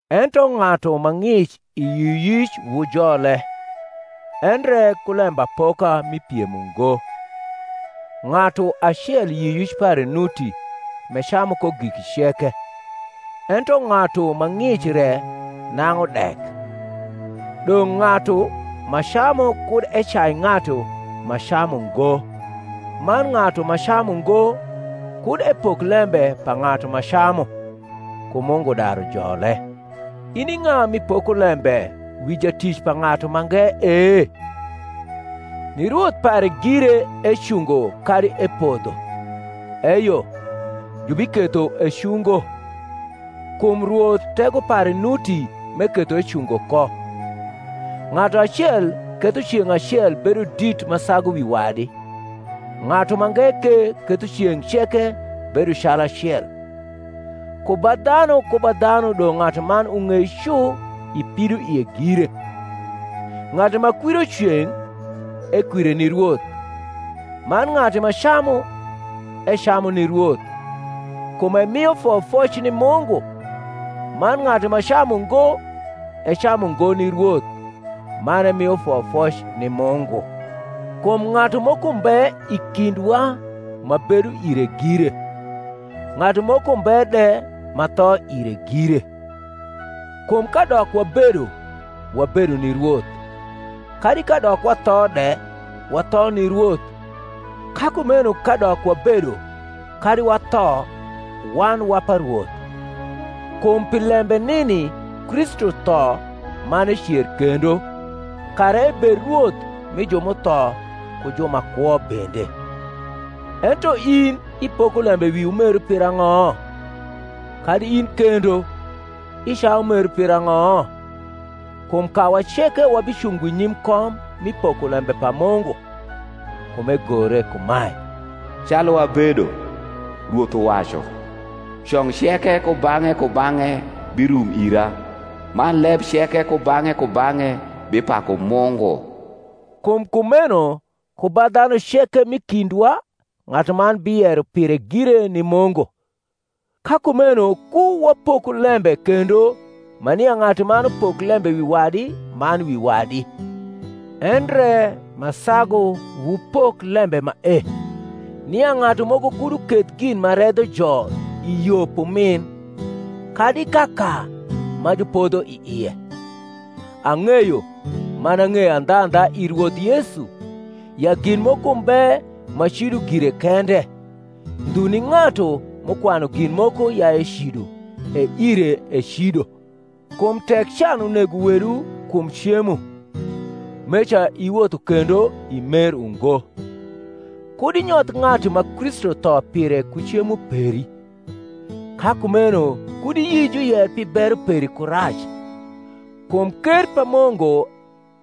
Ento ng’atu ma ng’ic i yioyic wujole, endre ku lembapoka mi piem ungo. Ng’atu acel yioyic pare nuti m’ecamu ko giki ceke; ento ng’atu ma ng’ic re nang’u dek. Dong’ ng’atu ma camu kud ecai ng’atu ma camu ngo; man ng’atu ma camu ngo kud epok lembe pa ng’atu ma camu: kum Mungu daru jole. In i ng’a m’ipoko lembe wi jatic pa ng’atu mange e? ni Rwoth pare gire ecungo kadi epodho. Eyo, jubiketho ecungo: kum Rwoth tego pare nuti m’eketho ecungo ko. Ng’atu acel ketho ceng’ acel bedo dit ma sagu wi wadi: ng’atu mange ke ketho ceng’ ceke bedo calacel. Ku ba dhanu ku ba dhanu dong’ ng’atuman ung’ei cu i pidoie gire. Ng’atu ma kwiro ceng’, ekwire ni Rwoth: man ng’atu ma camu, ecamu ni Rwoth, kum emio foyofoc ni Mungu; man ng’atu ma camu ngo, ecamu ngo ni Rwoth, man emio foyofoc ni Mungu. Kum ng’atu moko mbe i kindwa ma bedo ire gire, ng’atu moko mbe de ma tho ire gire. Kum kadok wabedo, wabedo ni Rwoth; kadi kadok watho de, watho ni Rwoth: ka kumeno kadok wabedo, kadi watho, wan wa pa Rwoth. Kum pi lembe nini Kristu tho man ecer kendo, kara ebed Rwoth mi ju m’utho ku ju ma kwo bende. Ento in, ipoko lembe wi umeru pirang’o? kadi in kendo, icayu umeru pirang’o? kum kawa ceke wabicungo nyim kom mi pokolembe pa Mungu. Kum egore kumae, Calu abedo, Rwoth uwacu, cong ceke kubang’e kubang’e birum ira, Man leb ceke kubang’e kubang’e bipaku Mungu. Kum kumeno ku ba dhanu ceke m’i kindwa ng’atuman biyero pire gire ni Mungu. Ka kumeno ku wapoku lembe kendo ma nia ng’atuman upok lembe wi wadi man wi wadi: endre ma sagu wupok lembe mae, nia ng’atu moko kud uketh gin ma redho jo i yo p’umin, kadi kaka ma jupodho i ie. Ang’eyo, man ang’eyo andhandha i Rwoth Yesu, ya gin moko mbe ma cido gire kende: ndhu ni ng’atu m’ukwanu gin moko ya ecido, e ire ecido. Kum tek can unego wedu kum cemo, meca iwotho kendo i mer ungo. Kud inyoth ng’atu ma Kristu tho pire ku cemo peri. Ka kumeno kud iyi juyer pi bero peri ku rac; kum ker pa Mungu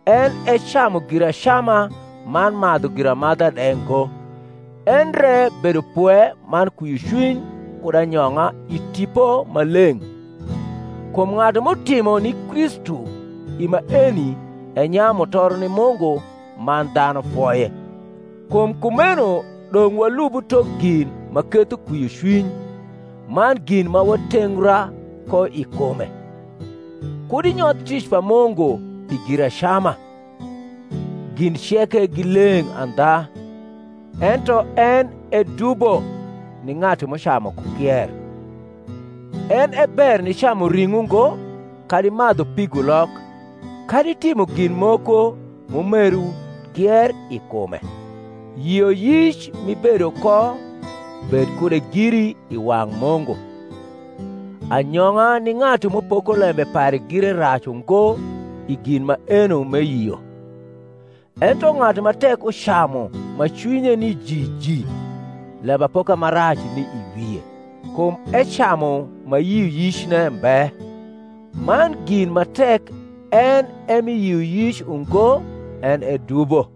en e camu guacama man madhu giramadha de ngo, endre bedopwe man kwiocwmy kud anyong’a i Tipo Maleng’. Kum ng’atu m’utimo ni Kristu i maeni enyayu mutoro ni Mungu man dhanu foye. Kum kumeno dong’ walubu tok gin ma ketho kwiocwiny, man gin ma watengra ko i kume. Kud inyoth tic pa Mungu pi giracama. Gin ceke gi leng’ andha; ento en e dubo ni ng’atu m’ucamu ku kier. En e ber nicamu ring’o ngo, kadi madhu pigulok, kadi timo gin moko m’umeru kier i kume. Yioyic m’ibedo ko, bed kude giri i wang’ Mungu. Anyong’a ni ng’atu m’upoko lembe pare gire rac ungo i gin maeno m’eyio. Ento ng’atu ma tek ucamu ma cwinye ni jiji lembapoka ma rac ni i wie, kum ecamu ma yioyicne mbe; man gin ma tek en e mi yioyic ungo en e dubo.